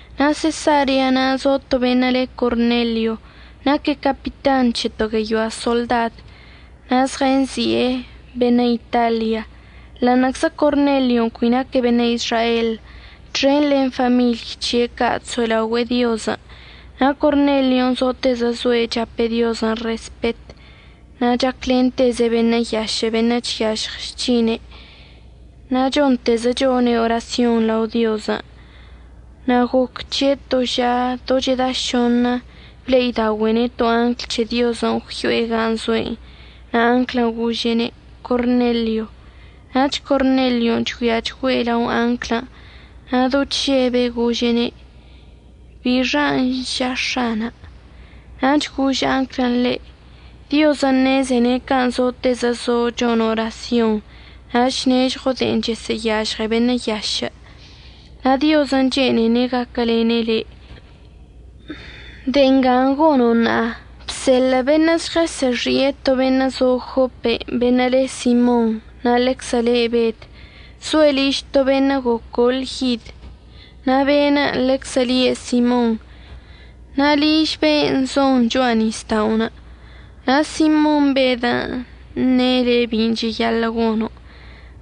Na' Sesarea na' zo to beṉə' le Cornelio, naque' capitan c̱he to gueyoa soḻdad, na' zɉənzi'e “Beṉə' Italia”. Ḻa'aṉə'əczə Cornelion' cui naque' beṉə' Izrael, txen len famiḻy c̱he' ca' chso'elaogüe'e Diozən' na' Cornelion' zotezə zoe' chape' Diozən' respet na' chaclenteze' beṉə' yašə' beṉə' chyažɉ chc̱hine, na' chontezə chone' orasyon lao Diozən'. Na' goc c̱he' to ža do cheda šoṉə ble'idaogüe'ene' to angl c̱he Diozən' gwyo'e gan' zo'enə' na' anglən' gože'ene': ―Cornelio. Nach Cornelion' chgüiachgüe' lao anglən' na' do chžebe' gože'ene': ―¿Bixan' ža X̱ana'? Nach gož anglən' ḻe': ―Diozən' ṉezene' can' zotezə zo' chono' orasyon na' chnežɉo' de'en chəsə'əyažɉe beṉə' yašə', na' Diozən' chene'ene' gaquəlene' le'. De'e nga gono' ṉa'a, bseḻə' beṉə' žɉəsə'əxi'e to beṉə' zo Jopen' beṉə' le Simon na' ḻeczə le Bed. Zoe' liž to beṉə' gocol yid na' be'enə' ḻeczə lie' Simon, na' liž ben' zon cho'a nisda'onə'. Na' Simon Bedən' əṉe' le' bin' cheyaḻə' gono'.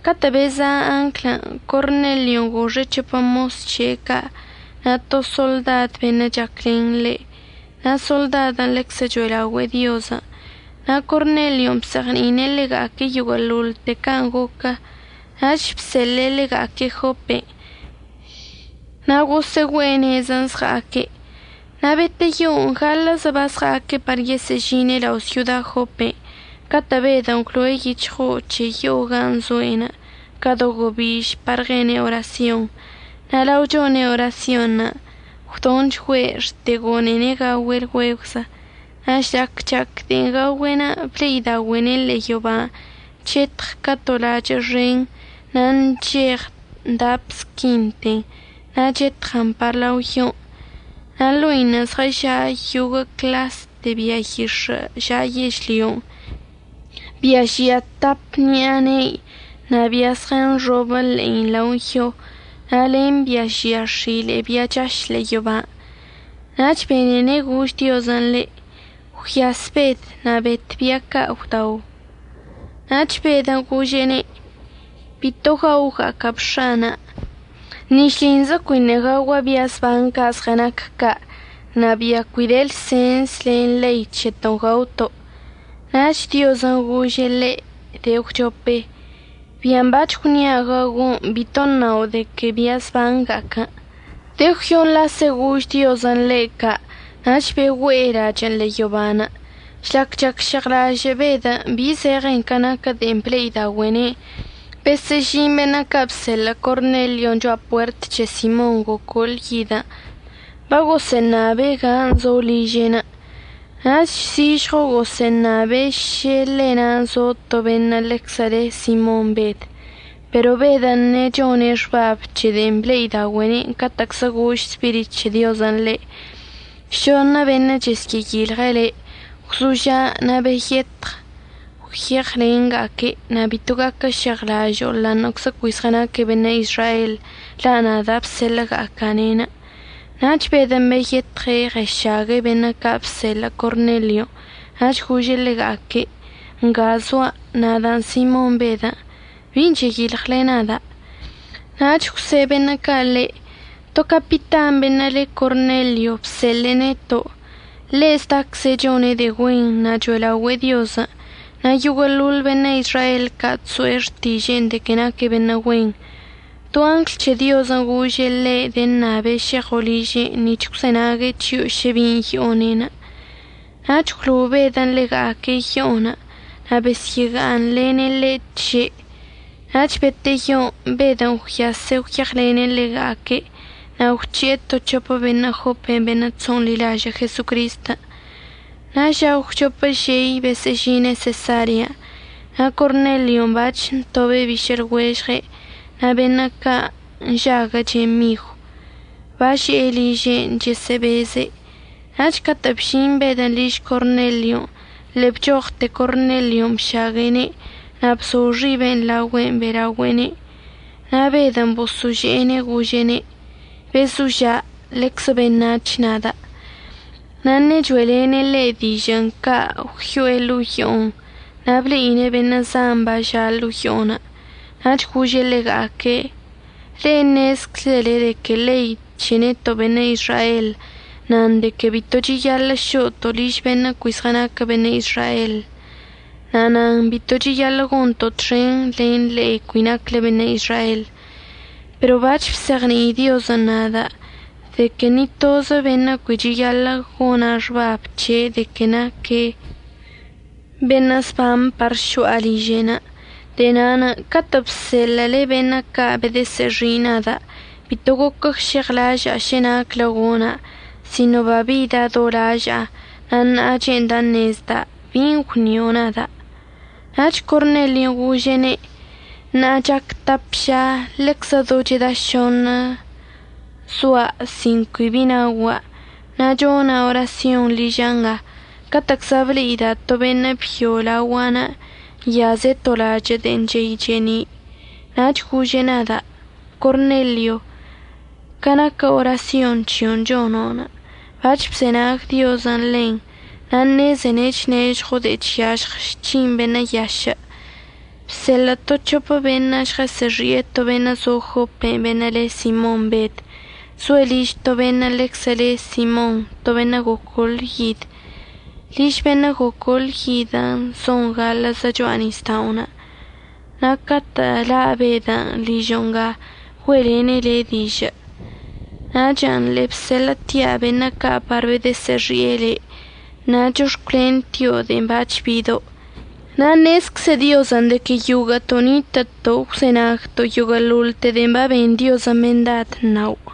Catə' beza' anglən' Cornelion' goxe' c̱hopə mos c̱he' ca' na' to soḻdad beṉə' chaclen ḻe', na' soḻdadən' ḻeczə cho'elaogüe'e Diozən'. Na' Cornelion' bzeɉni'ine' ḻega'aque' yoguə'əḻoḻte can' goquən' nach bseḻe'e ḻega'aque' Jopen'. Na' gosə'əgüe'e nezən' əzɉa'aque'. Na' beteyon' gaḻə'əzə bazɉa'aque' par yesə'əžine' lao' syoda Jopen' catə' Bedən' gwlo'e yic̱hɉo'o c̱he yo'o gan' zo'enə' ca do gobiž par ɉene' orasyon'. Na' lao chone' orasyonṉə' gwdonchgüe' xte gone'ene' gaogüe' lgüegwzə. Na' žlac chac de'en gaogüe'enə' ble'idaogüe'ene' ḻe'e yoban' chetɉ ca to lachə' xen na' ncheɉ dap squinten na' chetɉən par lao yon'. Na' ḻo'inə' zɉəža' yoguə' cḻaste bia yix̱ə' ža' yežlyon', bia žia tap ṉi'a ne'i na' bia zɉənxobə ḻe'i lao yon', na' len bia žia x̱ile'e bia chaš ḻe'e yoban'. Nach benene' gož Diozən' ḻe': ―Gwyas Bed na' bet bia ca' gwdao. Nach Bedən' gože'ene': ―Bito gaoga'aca'ab X̱ana'. Ni šlinzə cuiṉə' gaogua' bia zban ca' zɉənac ca' na' bia cui de lsens len ḻei c̱heto'onə' gaoto'. Nach Diozən' gože' ḻe' de'e əgwchope: ―Bian' bac̱h gwnia' gaogo' bito əṉao' de que bia əzbanga'aquən'. De'e gwyoṉ lase gož Diozən' ḻe' ca' nach begüe lachə'ən ḻe'e yoban'. Žlac chacžeɉlažə' Bedən' bi zeɉen ca naquə de'en ble'idaogüe'ene'enə' besə'əžin beṉə' ca' əbseḻə' Cornelion' cho'a puert c̱he Simon gocol yidən' bagosə'əṉabe' gan' zo liže'enə'. Nach zižɉo gosə'əṉabe' šə ḻe na' zo to beṉə' ḻeczə le' Simon Bed. Pero Bedən' ṉechone' xbab c̱he de'en ble'idaogüe'ene' catə'əczlə gož Spirit c̱he Diozən' ḻe': ―Šoṉə beṉə' chəsyə'əyilɉe' le'. Gwzoža' na' beyetɉ gwyeɉlenga'aque' na' bito gaquəžeɉlažo'o ḻa'aṉə'əczə cui zɉənaque' beṉə' Izrael la' nada' əbseḻə'əga'aca'ane'enə'. Nach Bedən' beyetɉe' ɉəšague' beṉə' ca' əbseḻə' Cornelion' nach gože' ḻega'aque': ―Nga zoa', nadan' Simon Bedən'. ¿Bin' cheyilɉle nada'? Nach gwse' beṉə' ca' ḻe': ―To capitan beṉə' le Cornelio əbseḻe'e neto'. Ḻe' zdacze' chone' de'e güen na' cho'elaogüe'e Diozən', na' yoguə'əḻoḻ beṉə' Izrael ca' chso'e xtiže'e de que naque' beṉə' güen. To angl c̱he Diozən' gože' ḻe' deṉabe' šeɉo' liže'enə' nic̱h əgwzenague' c̱hio' šə bin' yo'one'. Nach gwlo'o Bedən' ḻega'aque' yo'o na' besyə'əga'aṉlene' ḻe' tže'. Nach beteyon' Bedən' gwyase' gwyeɉlene' ḻega'aque' na' gwc̱he'e to c̱hopə beṉə' Jopen' beṉə' chso'onḻilažə' Jesocristən'. Na' ža əgwchop žei besə'əžine' Sesarean'. Na' Cornelion' bac̱h ntobe' bišə' lɉuežɉe' na' beṉə' ca' nžaguəche' migw, baže'e liže'enə' chesə'əbeze'. Na' catə' bžin Bedən' liž Cornelion' ḻe'e bchoɉte Cornelion' bšague'ene' na' bzo xibe' laogüe'enə' be'elaogüe'ene'. Na' Bedən' boso'ože'ene' gože'ene': ―Bezoža'. Ḻeczə beṉac̱h nada'. Na' ṉe'e cho'elene' ḻe' dižə'ən ca' gwyo'e ḻo'o yo'on na' ble'ine' beṉə' zan baža' ḻo'o yo'onə'. Nach gože' ḻega'aque': ―Ḻe'e ṉezczele de que ḻei c̱he neto' beṉə' Izrael nan de que bito cheyaḻə' šo'oto' liž beṉə' cui zɉənaquə beṉə' Izrael na' nan bito cheyaḻə' gonto' txen len le'e cui nacle beṉə' Izrael. Pero bac̱h bzeɉni'i Diozən' nada' de que ni tozə beṉə' cui cheyaḻə' gona' xbab c̱he' de que naque' beṉə' zban par šo'a liže'enə'. De'e na'anə' catə' bseḻə'əle beṉə' ca' bedəsə'əxi' nada' bito goquəžeɉlaža'a šə naclə gona' sino babida' do laža'a na' ṉa'a che'enda' əṉezda' ¿bin' gwnio' nada'? Nach Cornelion' gože'ene': ―Ṉa'a chac tap ža ḻeczə do cheda šoṉə zoa' sin cui bi naogua', na' chona' orasyon liža' nga, catə'əczla ble'ida' to beṉə' byo laogua'anə' nyaze' to lachə' de'e chey che'eni'. Nach gože' nada': “Cornelio, ca naquə orasyon c̱hio'onə' chono', bac̱h bzenag Diozən' ḻen na' ṉezene' chnežɉo' de'e chyažɉ chc̱hine beṉə' yašə'. Bseḻə' to c̱hopə beṉə' žɉəsə'əxi'e to beṉə' zo Jopen' beṉə' le Simon Bed. Zoe' liž to beṉə' ḻeczə le Simon, to beṉə' gocol yid. Liž beṉə' gocol yidən' zon gaḻə'əzə cho'a nisda'onə'. Na' catə' la' Bedən' ližo' nga güe'elene' le' dižə'.” Nachən' ḻe'e bseḻə'ətia' beṉə' ca' par bedə'əsə'əxi'e le', na' chox̱cwlentio' de'en bac̱h bido'. Na' ṉezcze Diozən' de que yoguə'əto' nitə'əto' əgwzenagto' yoguə'əḻoḻte de'en baben Diozən' mendad əṉao'.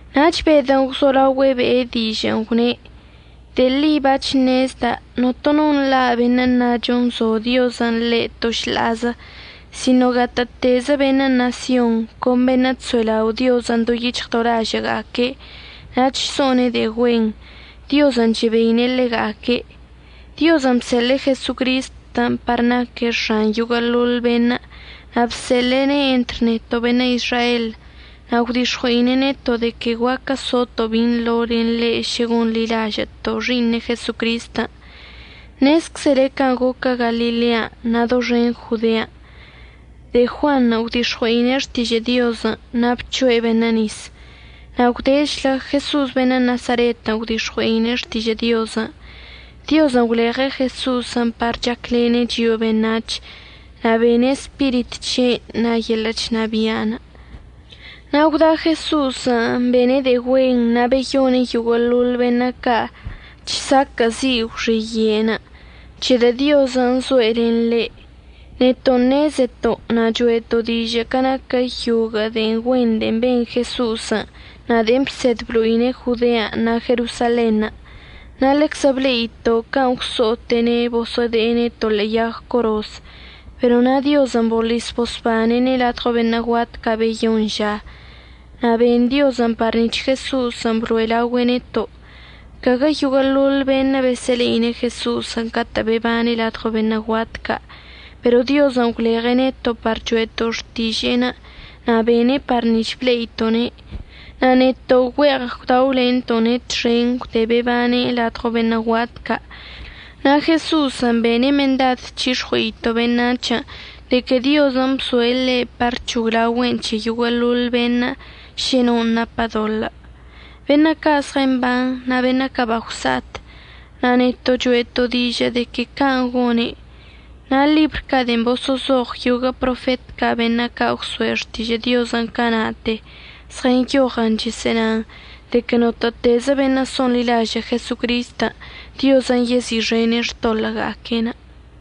Nach Bedən' gwzolaogüe' be'e dižə'ən gwne': ―De'e ḻi bac̱h ṉezda' notono nḻa' beṉə' əṉacho nzo Diozən' ḻe' to šḻa'azə. Sino que gatə'ətezə beṉə' ṉasyon con beṉə' chso'elao' Diozən' do yic̱hɉ do lažə'əga'aque' na' chso'one' de'e güen, Diozən' chebeine' ḻega'aque'. Diozən' bseḻe'e Jesocristən' par naque' X̱an yoguə'əḻoḻ beṉə', na' bseḻe'ene' entr neto' beṉə' Izrael, na' gwdix̱ɉue'ine' neto' de que guaquə soto' binḻo len ḻe' šə gonḻilažə'əto' Xi'iṉe' Jesocristən'. Ṉezczele can' goquə Galilean' na' doxen Jodean'. De'e Juanṉə' gwdix̱ɉui'e xtižə' Diozən' na' bc̱hoe' beṉə' nis. Na' gwdechlə Jeso'os beṉə' Nasaretən' gwdix̱ɉui'e xtižə' Diozən'. Diozən' gwleɉe' Jeso'osən' par chaclene' chio'o beṉac̱h na' be'ene' Spirit c̱he'enə' na' yeḻə' chnabia'. Na' gwda Jeso'osən' bene' de'e güen na' beyone' yoguə'əḻoḻ beṉə' ca' chsaquə'əzi' gwxiye'enə', c̱hedə' Diozən' zoe' len ḻe'. Neto' ṉezeto' na' cho'eto' dižə' ca naquə yoguə' de'e güenṉə' de'e ben Jeso'osən' na' de'en bsed blo'ine' Jodean' na' Jerosalenṉə', na' ḻeczə ble'ito' can' gwso'ote'ene' boso'ode'ene' to ḻe'e yag coroz. Pero na' Diozən' boḻis bosbane'ene' ladɉo beṉə' guat ca' beyoṉ ža na' ben Diozən' par nic̱h Jeso'osən' blo'e laogüe' neto'. Caguə yoguə'əḻoḻ beṉə' besə'əle'ine' Jeso'osən' catə'ən bebane' ladɉo beṉə' guat ca', pero Diozən' gwleɉe' neto' par cho'eto' xtiže'enə' na' bene' par nic̱h ble'ito'one'. Na' neto' güe'eɉ gwdaolento'one' txen gwde bebane' ladɉo beṉə' guat ca'. Na' Jeso'osən' bene' mendad c̱hix̱ɉue'ito' beṉac̱hən' de que Diozən' əbzoe' ḻe' par əc̱hoglaogüe'en c̱he yoguə'əḻoḻ beṉə' šə non' napə doḻə', beṉə' ca' zɉəmban na' beṉə' ca' bagwsa'at, na' neto' cho'eto' dižə' de que can' gone'. Na' ḻibr ca' de'en boso'ozoɉ yoguə' profet ca' beṉə' ca' gwso'e xtižə' Diozən' cana'ate zɉənyoɉən chesə'ənan de que notə'ətezə beṉə' so'onḻilažə' Jesocristən' Diozən' yezi'ixene' xtoḻə'əga'aque'enə'.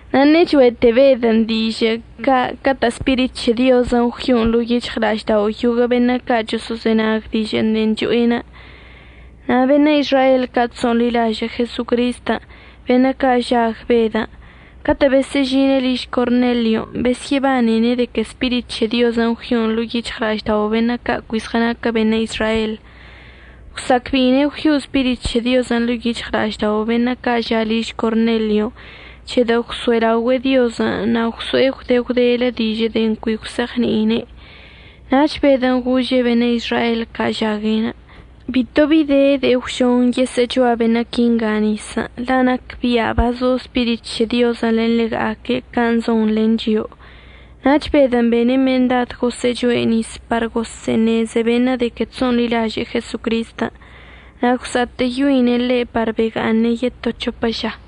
Ṉe'e cho'ete Bedən' dižə'ən ca' catə' Spirit c̱he Diozən' gwyo'on ḻo'o yic̱hɉla'aždao' yoguə' beṉə' ca' choso'ozenag dižə' de'en choe'enə'. Na' beṉə' Izrael ca' chso'onḻilažə' Jesocristən', beṉə' ca' žag Bedən' catə'ən besə'əžine' liž Cornelion', besyə'əbanene' de que Spirit c̱he Diozən' gwyo'on ḻo'o yic̱hɉla'aždao' beṉə' ca' cui zɉənaquə beṉə' Izrael. Gwsa'acbe'ine' gwyo'o Spirit c̱he Diozən' ḻo'o yic̱hɉla'aždao' beṉə' ca' ža' liž Cornelion' c̱hedə' gwso'elaogüe'e Diozən' na' gwso'e gwde gwdelə dižə' de'en cui gwse'eɉni'ine'. Nach Bedən' gože' beṉə' Izrael ca' žague': ―Bito bi de de'e gwžon yesə'əchoa beṉə' quinga nisən', la' nacbia' bazo Spirit c̱he Diozən' len ḻega'aque' can' zon len chio'o. Nach Bedən' bene' mendad gosə'əchoe' nis par gosə'əṉeze beṉə' de que chso'onḻilaže'e Jesocristən'. Na' gwsa'atə'əyoine' ḻe' par bega'aṉe' yeto c̱hopə ža.